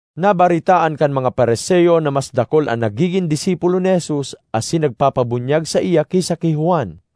Nabaretaan kan mga Fariseo na mas dakul an nagigin disipulo ni Jesus asin nagpapabunyag saiya ki sa ki Juan.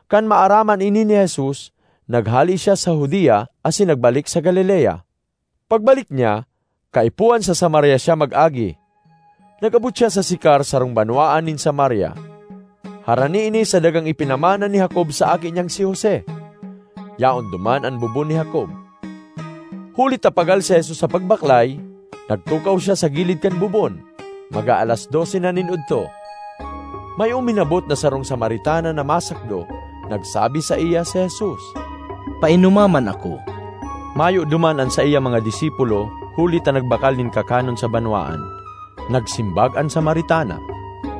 Kan maaraman ini ni Jesus, naghale siya sa Judea asin nagbalik sa Galilea. Pagbalik niya, kaipuhan sa Samaria siya mag-agi. Nag-abot siya sa Sicar, sarong banwaan nin Samaria. Harani ini sa dagang ipinamana ni Jacob sa aki niyang si Jose. Yaon duman an bubon ni Jacob. Huli ta pagal si Jesus sa pagbaklay, nagtukaw siya sa gilid kan bubon. Mag-aalas dose na nin odto. May uminabot na sarong Samaritana na masakdo. Nagsabi saiya si Jesus, “Painoma man ako.” (Mayo duman an saiyang mga disipulo huli ta nagbakal nin kakanon sa banwaan.) Nagsimbag an Samaritana,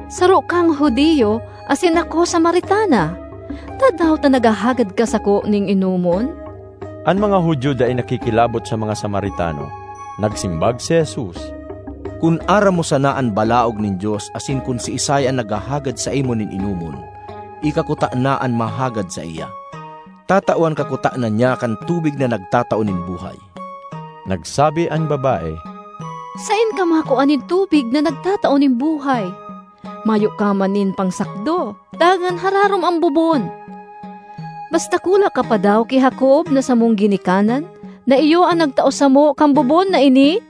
“Saro kang Judio asin ako Samaritana, tadaw ta naghahagad ka sako nin inomon?” (An mga Judio dai nakikilabot sa mga Samaritano.) Nagsimbag si Jesus, “Kun aram mo sana an balaog nin Dios asin kun siisay an naghahagad saimo nin inomon, ika kutana an mahagad saiya. Tatawan ka kutana niya kan tubig na nagtatao nin buhay.” Nagsabi an babae, “Saen ka makua nin tubig na nagtatao nin buhay? Mayo ka man nin pangsakdo dangan hararom an bubon. Mas dakula ka pa daw ki Jacob na samong ginikanan na iyo an nagtao samo kan bubon na ini?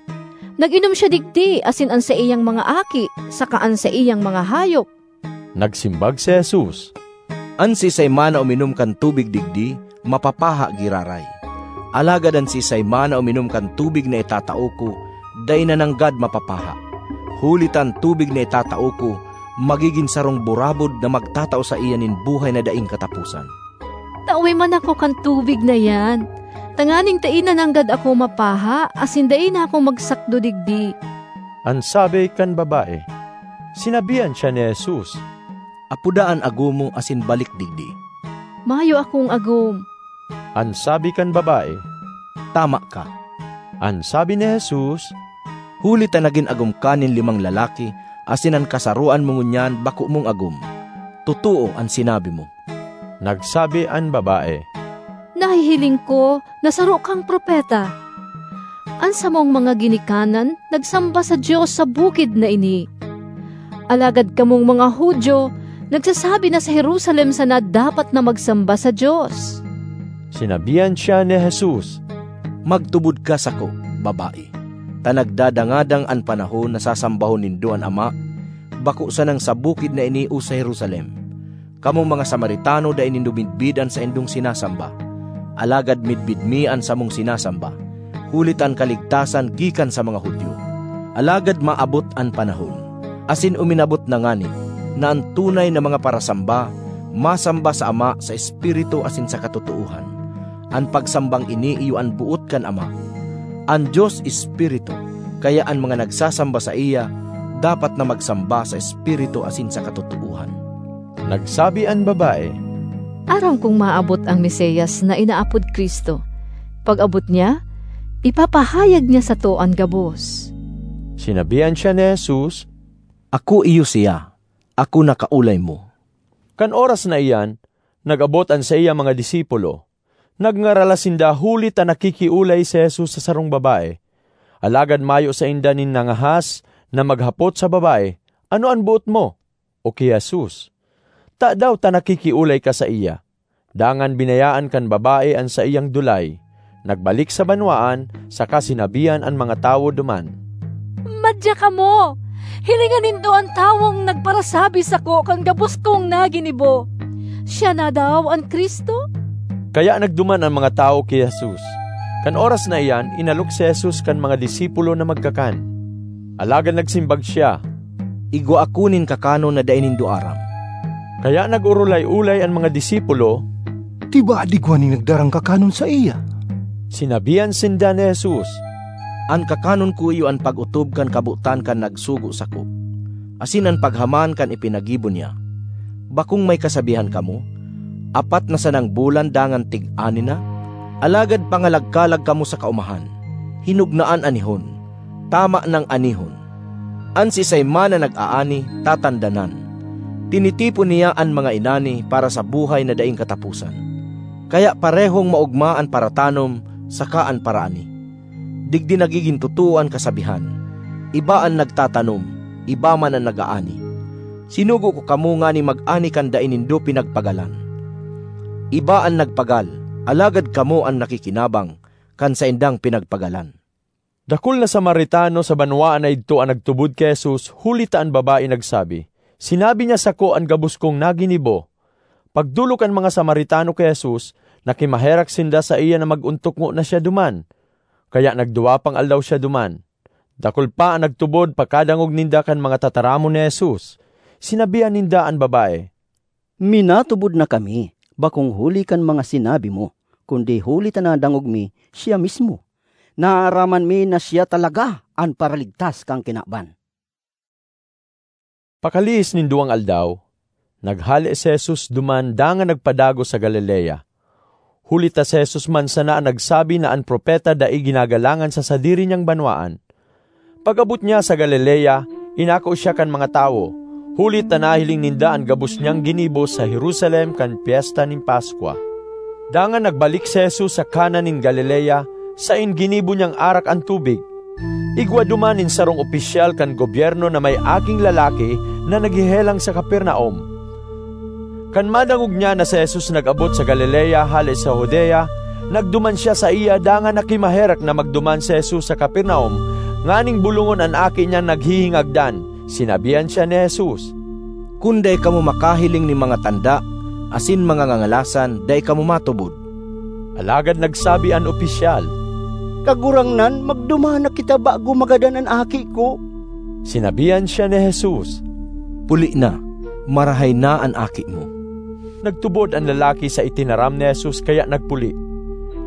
Nag-inom siya digdi asin an saiyang mga aki saka an saiyang mga hayop.” Nagsimbag si Jesus, “An siisay man na uminom kan tubig digdi, mapapaha giraray; alagad an siisay man na uminom kan tubig na itatao ko, dai na nanggad mapapaha. Huli ta an tubig na itatao ko magigin sarong burabod na magtatao saiya nin buhay na daing kataposan.” ”Tawe man ako kan tubig na iyan, tanganing dai na nanggad ako mapaha asin dai na ako magsakdo digdi,” an sabi kan babae. Sinabihan siya ni Jesus, “Apoda an agom mo asin balik digdi.” ”Mayo akong agom,” an sabi kan babae. “Tama ka,” an sabi ni Jesus, ”huli ta nagin agom ka nin limang lalaki asin an kasaroan mo ngunyan bako mong agom. Totoo an sinabi mo.” Nagsabi an babae, “Nahihiling ko na saro kang propeta. An samong mga ginikanan nagsamba sa Dios sa bukid na ini, alagad kamong mga Judio nagsasabi na sa Jerusalem sana dapat na magsamba sa Dios.” Sinabihan siya ni Jesus, “Magtubod ka sako, babae, ta nagdadangadang an panahon na sasambahon nindo an Ama bako sanang sa bukid na ini o sa Jerusalem. Kamong mga Samaritano, dai nindo midbid an saindong sinasamba, alagad midbid mi an samong sinasamba, huli ta an kaligtasan gikan sa mga Judio. Alagad maabot an panahon, asin uminabot na ngani, na an tunay na mga parasamba masamba sa Ama sa espiritu asin sa katotoohan. An pagsambang ini iyo an boot kan Ama. An Dios Espiritu, kaya an mga nagsasamba saiya dapat na magsamba sa espiritu asin sa katotoohan.” Nagsabi an babae, “Aram kong maabot an Mesias na inaapod Cristo. Pag-abot niya, ipapahayag niya sato an gabos.” Sinabihan siya ni Jesus, “Ako iyo siya, ako na kaolay mo.” Kan oras na iyan, nag-abot an saiyang mga disipulo. Nagngaralas sinda huli ta nakikiolay si Jesus sa sarong babae. Alagad mayo sainda nin nangahas na maghapot sa babae, “Ano an boot mo?” o ki Jesus, “Tadaw ta nakikiolay ka saiya?” Dangan binayaan kan babae an saiyang dulay, nagbalik sa banwaan, saka sinabihan an mga tawo duman, ”Madya kamo! Hilinga nindo an tawong nagparasabi sako kan gabos kong naginibo. Siya na daw an Cristo?” Kaya nagduman an mga tawo ki Jesus. Kan oras na iyan, inalok si Jesus kan mga disipulo na magkakan. Alagad nagsimbag siya, “Igwa ako nin kakanon na dai nindo aram.” Kaya nag-orolay-olay an mga disipulo, “Tibaad igwa nin nagdarang kakanon saiya.” Sinabihan sinda ni Jesus, “An kakanon ko iyo an pag-otob kan kabotan kan nagsugo sako, asin an paghaman kan ipinagibo niya. Bakong may kasabihan kamo, ‘Apat na sanang bulan dangan tig-ani na?’ Alagad pangalagkalag kamo sa kaomahan: hinog na an anihon, tama nang anihon! An siisay man na nag-aani tatandanan; tinitipon niya an mga inani para sa buhay na daing kataposan. Kaya parehong maogma an paratanom saka an paraani! Digdi nagigin totoo an kasabihan, ‘Iba an nagtatanom, iba man an nag-aani!’ Sinugo ko kamo nganing mag-ani kan dai nindo pinagpagalan; iba an nagpagal, alagad kamo an nakikinabang kan saindang pinagpagalan.” Dakul na Samaritano sa banwaan na idto an nagtubod ki Jesus huli ta an babae nagsabi, “Sinabi niya sako an gabos kong naginibo.” Pagdolok kan mga Samaritano ki Jesus, nakimaherak sinda saiya na mag-ontok ngona siya duman; kaya nagduwa pang aldaw siya duman. Dakul pa an nagtubod pakadangog ninda kan mga tataramon ni Jesus. Sinabihan ninda an babae, “Minatubod na kami, bakong huli kan mga sinabi mo, kundi huli ta nadangog mi siya mismo. Naaraman mi na siya talaga an Paraligtas kan kinaban.” Pakalihis nin duwang aldaw, naghale si Jesus duman dangan nagpadagos sa Galilea. Huli ta si Jesus man sana an nagsabi na an propeta dai ginagalangan sa sadiri niyang banwaan. Pag-abot niya sa Galilea, inako siya kan mga tawo, huli ta nahiling ninda an gabos niyang ginibo sa Jerusalem kan Pyesta nin Paskwa. Dangan nagbalik si Jesus sa Cana nin Galilea, saen ginibo niyang arak an tubig. Igwa duman nin sarong opisyal kan gobyerno na may aking lalaki na naghehelang sa Capernaum. Kan madangog niya na si Jesus nag-abot sa Galilea hale sa Judea, nagduman siya saiya dangan nakimaherak na magduman si Jesus sa Capernaum nganing bolongon an aki niyang naghihingagdan. Sinabihan siya ni Jesus, “Kun dai kamo makahiling nin mga tanda asin mga ngangalasan dai kamo matubod.” Alagad nagsabi an opisyal, “Kagurangnan, magduman na kita bago magadan an aki ko!” Sinabihan siya ni Jesus, “Puli na; marahay na an aki mo!” Nagtubod an lalaki sa itinaram ni Jesus kaya nagpuli.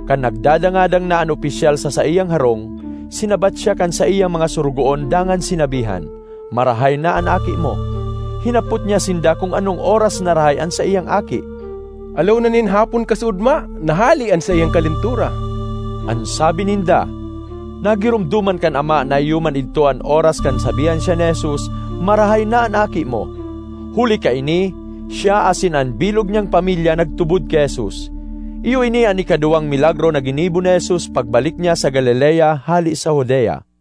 Kan nagdadangadang na an opisyal sa saiyang harong, sinabat siya kan saiyang mga sorogoon dangan sinabihan, “Marahay na an aki mo!” Hinapot niya sinda kun anong oras narahay an saiyang aki. “Ala una nin hapon kasuodma, nahale an saiyang kalentura.” an sabi ninda. Nagiromdoman kan ama na iyo man idto an oras kan sabihan siya ni Jesus, “Marahay na an aki mo.” Huli kaini, siya asin an bilog niyang pamilya nagtubod ki Jesus. Iyo ini an ikaduwang milagro na ginibo ni Jesus pagbalik niya sa Galilea hale sa Judea.